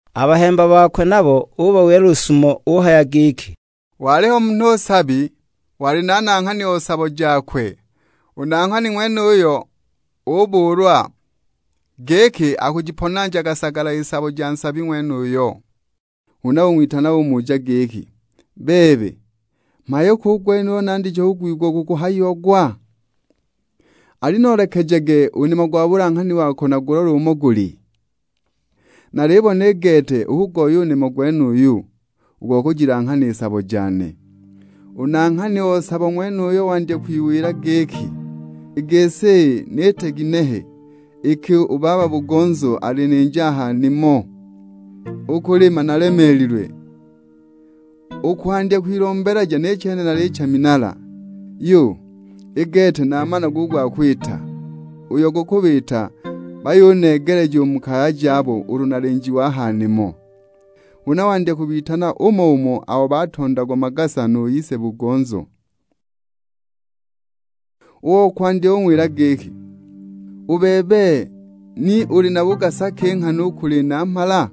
A bahemba bakwe nabo ubawila lusumo; uhaya giki, "Waliho munhu nsabi, wali na nanghani o sabo jakwe. U nanghani ng'wenuyo ubuulwa, giki akujiponanjaga sagala i sabo ja nsabi ng'wenuyo. Huna ung'witana umuja giki, 'Bebe, mhayo ki u gwenuyu nandije kwigwa gukuhayiagwa? Alinoolekejage u nimo gwa bulanghani wako nagulole umo guli. Nalibona i gete ukugoya u nimo gwenuyu, u go kujilanghana i sabo jane!' U nanghani o sabo ng'wenuyo wandya kwiwila giki, 'I gisi, niite ginehe iki u baba-bugonzo alininja a ha nimo? U kulima nalemeelilwe, u kwandya kwilombeleja ni chene nalicha minala! Yu, i gete namana u gwa kwita; uyo gukubiita bayuneegeleja u mu kaya jabo ulu nalinjiwe a ha nimo!' Huna wandya kubitana umo-umo abo batondagwa magasa nu ise-bugonzo. O kwandya ung'wila giki, 'U bebe, ni uli na bugasa ki nghana u kuli namhala?'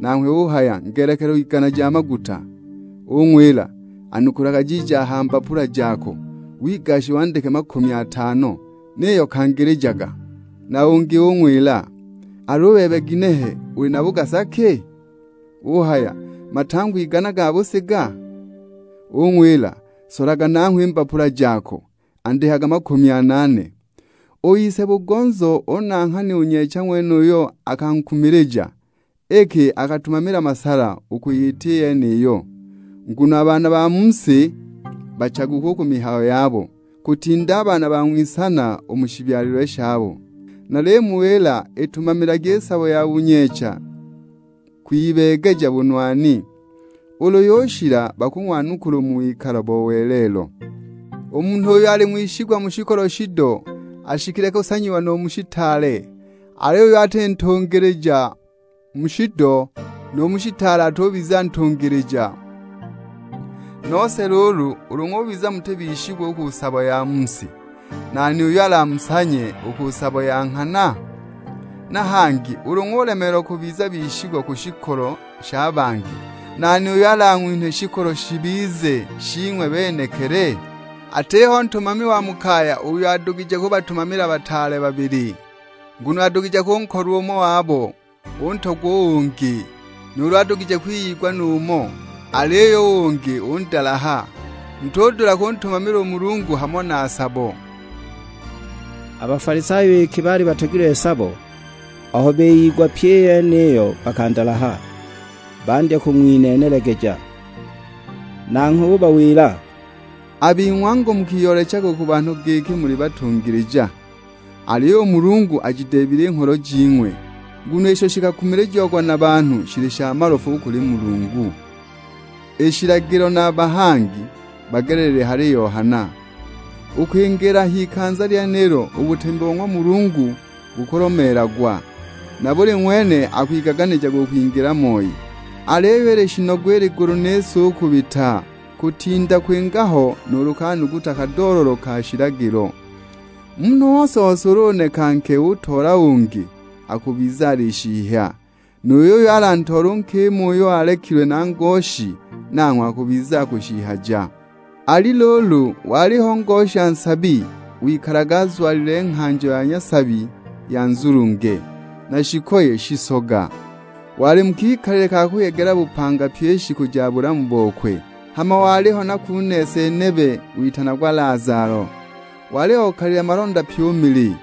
Nanghwe uhaya 'Ngelekelo igana ja maguta.' Ung'wila, 'Anukulaga jiiji aha mbapula jako, wigashe wandike makumi atano; niyo kangilijaga.' Na ungi ung'wila, 'Al'u bebe ginehe, uli na bugasa ki?' Uhaya, 'Matangwa igana ga busiga?' Ung'wila, 'Solaga nangho i mbapula jako, andikaga makumi anaane!' U ise-bugonzo o nanghani u nyeecha ng'wenuyo akankumilija, iki akatumamila masala u kwiyita i yeniyo. Nguno a baana ba mu si bachaguku u ku mihayo yabo, kutinda a baana ba ng'wisana u mu shibyalilwe shabo. Nalimuwila itumamilagi i sabo ya bunyeecha kwibeegeja bunwani, ulu yushila bakung'wanukula u mu wikalo bo welelo. U munhu uyo ali ng'wishigwa mu shikolo shido ashikile kusanyiwa nu mu shitaale; aliyo uyo ati ntungilija mu shido, nu mu shitaale atubiza ntungilija. Nose luulu ulu ng'ubiza muti bishigwa u ku sabo ya mu si, nani uyo alamusanye u ku sabo ya nghana? Na hangi ulu ng'ulemeelwa kubiza bishigwa ku shikolo sha bangi, nani uyo alang'winhe shikolo shibize shing'we benekili? Atiho ntumami wa mu kaya uyo adugije kubatumamila bataale babili, nguno adugije kunkolwa umo wabo, untogwa u ungi; nuulu adugije kwiyigwa nu umo, aliyo u ungi undalaha. Mutudula kuntumamila u Mulungu hamo na sabo!" A Bafalisayo iki baali batogilwe sabo, aho biyigwa pyi i yeniyo bakandalaha; bandya kung'wineenelegeja. Nanghwe ubawila, "A bing'we angu mukiyoolechaga u ku banhu giki muli batungilija, aliyo u Mulungu ajideebile i ngholo jing'we; nguno isho shikakumilijiagwa na banhu shili sha malofu u kuli Mulungu. I shilagilo na a bahangi, bagelelile hali Yohana; u kwingiila a h'ikanza lyenilo u butemi bo ng'wa Mulungu bukulomeelagwa, na buli ng'wene akwigaganijaga u kwingila moi. Aliyo ili shinogu i ligulu ni si u kubita, kutinda kwinga ho nuulu kanuguta kadoololo ka shilagilo. Munhu ose-ose ulu uneka nke utoola ungi, akubiza alishihya. Nu yuyo alantoole u nkima uyo alekilwe na ngoshi, nanghwe akubiza akushihyaga. "Ali luulu, waliho ngosha nsabi, wikalaga azwalile nghanjo ya nyasabi ya nzulunge, na shikoye shisoga; wali mu kikalile ka kuyegela bupanga pyi i shiku ja bulamu bokwe. Hama waliho na kunese nebe witanagwa Lazalo: wali okalile malonda pyi u mili.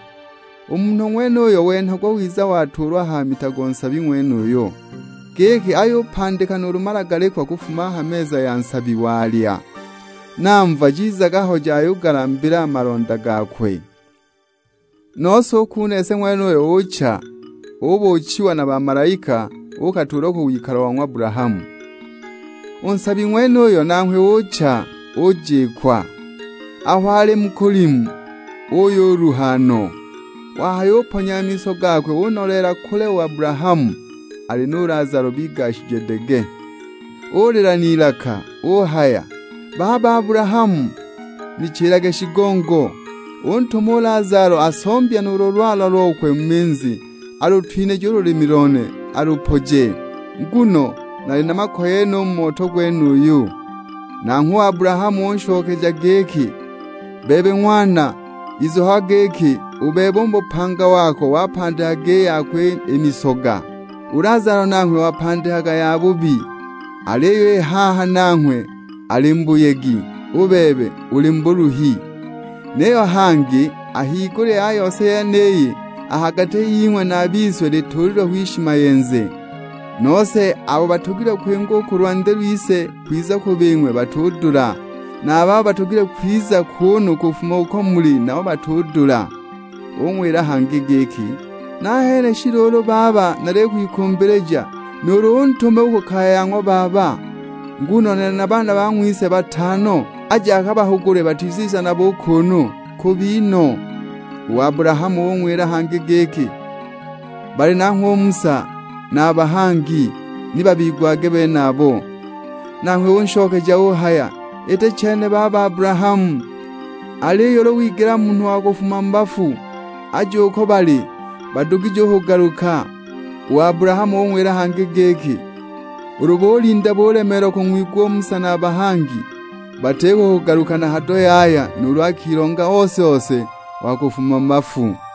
U munhu ng'wenuyo wenhagwa wiza watuulwa ha mita go nsabi ng'wenuyo, giki ayupandika nuulu malagalikwa kufuma a ha meza ya nsabi walya; na mva jizaga ho jayugalambila a malonda gakwe! Nose u kunese ng'wenuyo ucha, ubuuchiwa na bamalaika; uukatuulwa ku wikalo bo ng'wa Abulahamu. U nsabi ng'wenuyo nanghwe ucha, ujikwa. Aho ali mu kulimu uyuluha no, wahayuponya a miso gakwe unoleela kule u Abulahamu, ali nu Lazalo bigashije dege. Ulila n'ilaka; uhaya, 'Baba Abulahamu, nichilage shigongo, untume u Lazalo asombye nuulu lwala lokwe mu minzi alutwinije u lulimi lone alupoje; nguno nali na makoye no u mu moto gwenuyu!' Nanghwe u Abulahamu unshokeja giki, 'Bebe ng'wana, izukagwa giki u bebe u mu bupanga wako wapandikaga i yako i misoga. U Lazalo nanghwe wapandikaga yabubi, aliyo i haha nanghwe ali mu buyegi; u bebe uli mu buluhi. Niyo hangi a higulya ya yose yeniyi, a ha gati ying'we na a bise lituulilwe ho ishimayenze, nose abo batogilwe kwinga u ku lwandi lwise kwiza ku bing'we batudula; na a babo batogilwe kwiza kuunu kufuma uko muli nabo batudula.' Ung'wila hangi giki, 'Nahene shi luulu baba nalikwikumbilija, nuulu untume u ku kaya ya ng'wa baba. Nguno nali na baana bang'wise batano; aje akabahugule batiziza nabo u kuunu; kubi no!' U Abulahamu ung'wila hangi giki, 'Bali nanghwe u Musa na a bahangi, ni babigwage benabo.' Nanghwe unshokeja uhaya, 'Iti chene baba Abulahamu, aliyo ulu wigela munhu wa kufuma mu bafu aje uko bali, badugije u kugaluka.' U Abulahamu ung'wila hangi giki, 'Ulu bulinda bulemeelwa kung'wigwa u Musa na a bahangi, batiko u kuhuguka na hado yaya nuulu akilonga ose-ose wa kufuma mu bafu!' "